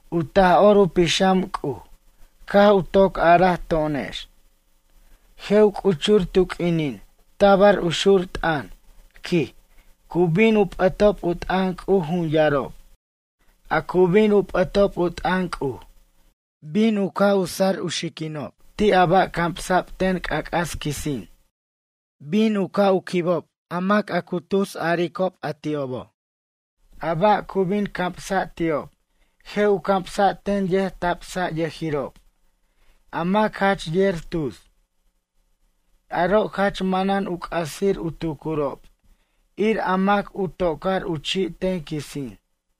U Taj'or u Pixam C'uj caj u toc araj to'onex: ―Je' u c'uchur tu q'uinin tabar u xur t'ʌn, quij, cu bin u p'ʌtob u t'ʌn C'uj jun yarob. A cu bin u p'ʌtob u t'ʌn C'uj, bin u ca' sar u xiquinob ti' a ba' camsa'b ten c'ac'as quisin. Bin u ca' u quibob a mac a cu tusarob a ti'obo'. A ba' cu bin camsa' ti'ob je' u camsa' ten yʌjtabsayʌjirob, a mac jach yer tus. Aro' jach manan u c'asir u tucurob ir a mac u tocar u chi' ten quisin.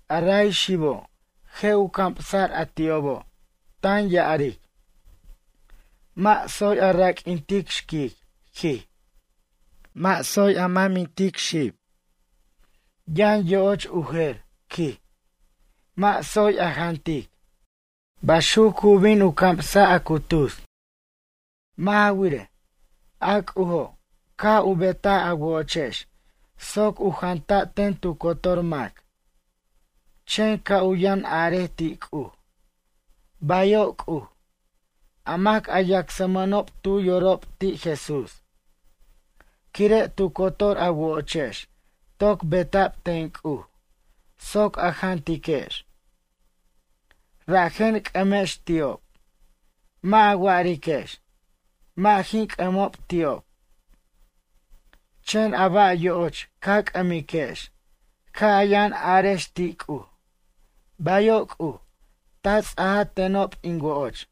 A ray xibo' je' u camsa'r a ti'obo' tan ya'aric: “Mʌ' tsoy a raq'uintic xquic, quij. Mʌ' tsoy a mʌmintej xib. Yʌn yo'och u jer, quij, mʌ' tsoy a jantic.” Baxuc cu bin u camsa' a cu tus. Mʌ' ja wirej, a C'ujo' caj u betaj a wo'ochex soc u janta' ten tu cotor mac. Chen ca' u yʌn arej ti' C'uj: “Bayo' C'uj”, a mac a yacsmʌnob tu yorob ti' Jesús. Quire' tu cotor a wo'ochex toc beta'b ten C'uj soc a jantiquex. Rajen c'ʌmex ti'ob. Mʌ' a wa'ariquex: ―Mʌ' jin c'ʌmob ti'ob. Chen a ba' yo'och ca c'ʌmiquex ca' a yʌn arex ti' C'uj: ―Bayo' C'uj ta ts'a tenob in wo'och.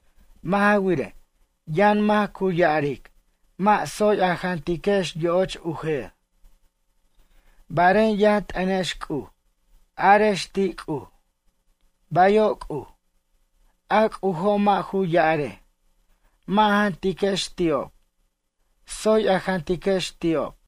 Mʌ' ja wirej, yʌn mac cu ya'aric mʌ' tsoy a jantiquex yo'och u jer. Barej yʌn t'ʌnex C'uj, arex ti' C'uj: ―Bayo' C'uj. A C'ujo' mʌ' ju ya'arej: ―Mʌ' a jantiquex ti'ob. Tsoy a jantiquex ti'ob.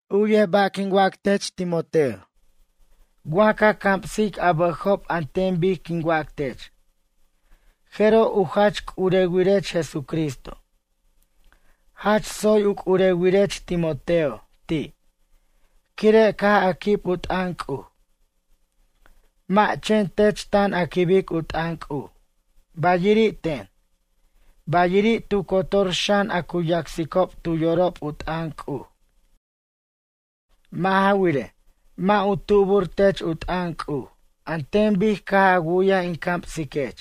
U'yej ba' quin wac tech, Timoteo. Wa ca camsic a bʌjob an ten bic quin wac tech. Jeroj u jach c'urewirech Jesucristo. Jach tsoy u c'urewirech Timoteo ti', quire' caj a quib u t'ʌn C'uj. Mʌ' chen tech tan a quibic u t'ʌn C'uj bayiri' ten, bayiri' tu cotor xan a cu yacsob tu yorob u t'ʌn C'uj. Mʌ' ja wirej, mʌ' u tubur tech u t'ʌn C'uj an ten bic caj a wu'yaj in camsiquech.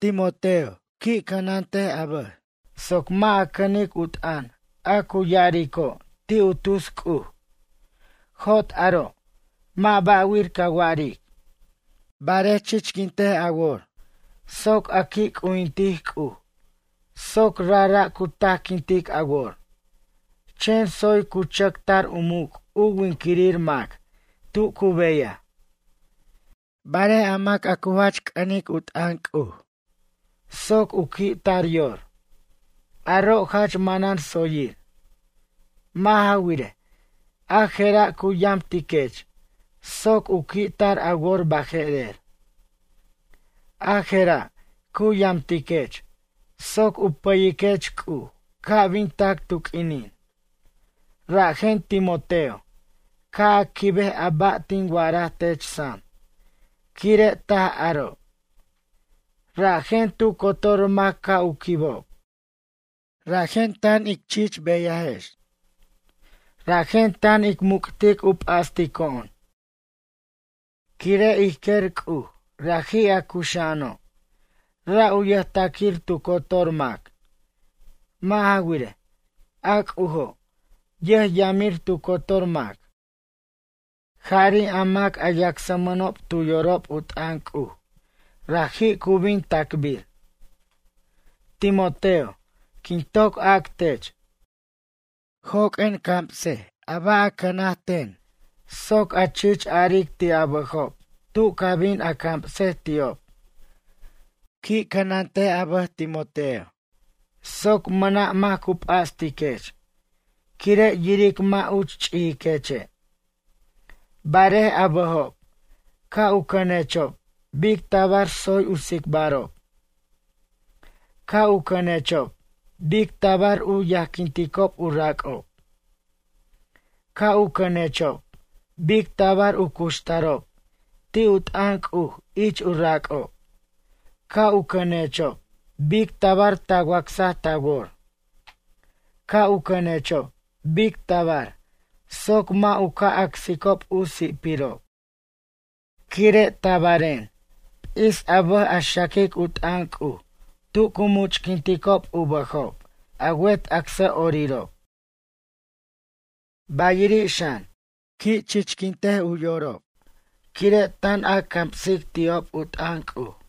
Timoteo, qui' cʌnant a bʌj soc mʌ' a cʌnic u t'ʌn a cu ya'arico' ti' u tus C'uj. Jot aro' mʌ' ba'wir ca wa'aric. Barej chichquint a wor soc a qui' c'ujintic C'uj soc rajra' cu tajquintic a wor. Chen tsoy cu chʌc tar u muc' u winquirir mac tu cu beyaj. Barej a mac a cu jach c'ʌnic u t'ʌn C'uj soc u qui' tar yor, aro' jach manan tsoyir. Mʌ' ja wirej, a je'ra' cu yamtiquech soc u qui' tar a wor baje'rer. A je'ra' cu yamtiquech soc u pʌyiquech C'uj ca' bin tac tu q'uinin. Rajen Timoteo, ca' a quibej a ba' tin wa'araj tech sam quire' taj aro'. Rajen tu cotor mac ca' u quibob. Rajen tan ic chich beyajex. Rajen tan ic muc'tic u p'astico'on, quire' ij quer C'uj raji' a cuxa'ano'. Ra' u yʌjtaquir tu cotor mac. Mʌ' ja wirej, a C'ujo' yʌjyamir tu cotor mac. Jari' a mac a yacsmʌnob tu yorob u t'ʌn C'uj, raji' cu bin tacbir. Timoteo, quin toc ac tech. Joq'uen cams a ba' a cʌna ten soc a chich aric ti' a bʌjob tu ca bin a camsej ti'ob. Qui' cʌnant a bʌj Timoteo soc mʌna' mac cu p'astiquech quire' yiric mʌ' uch ch'ijiqueche'. Barej a bʌjob, ca' u cʌnechob bic tabar tsoy u tsicbarob. Ca' u cʌnechob bic tabar u yajquinticob u rac'ob. Ca' u cʌnechob bic tabar u cuxtarob ti' u t'ʌn C'uj ich u rac'ob. Ca' u cʌnechob bic tabar ta wacsa ta wor. Ca' u cʌnechob bic tabar soc mʌ' u ca' acsicob u si'pirob. Quire' tabaren. P'is a bʌj a xaquic u t'ʌn C'uj tu cu much'quinticob u bʌjob a wet acsʌ'orirob. Bayiri' xan, qui' chichquint u yorob quire' tan a camsic ti'ob u t'ʌn C'uj.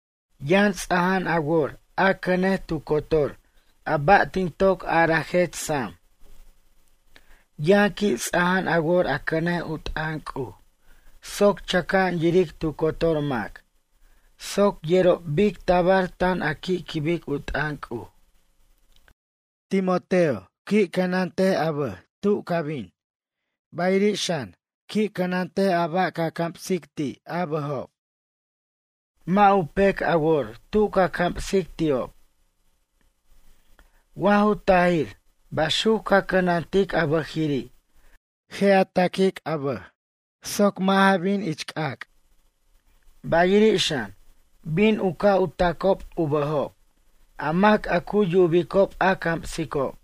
Yʌn ts'aja'an a wor a cʌnej tu cotor a ba' tin toc arajech sam. Yʌn qui' ts'aja'an a wor a cʌnej u t'ʌn C'uj soc chʌca'an yiric tu cotor mac. Soc yerob bic tabar tan a qui' quibic u t'ʌn C'uj. Timoteo, qui' cʌnant a bʌj tu ca bin. Bayiri' xan qui' cʌnant a ba' ca camsic ti' a bʌjob. Mʌ' u pec a wor tu ca camsic ti'ob. Wa ju tajir baxuc ca cʌnantic a bʌjiri' je' a taquic a bʌj soc mʌ' ja bin c'ac'. Bayirir' xan bin u ca' u tacob u bʌjob a mac a cu yubicob a camsicob.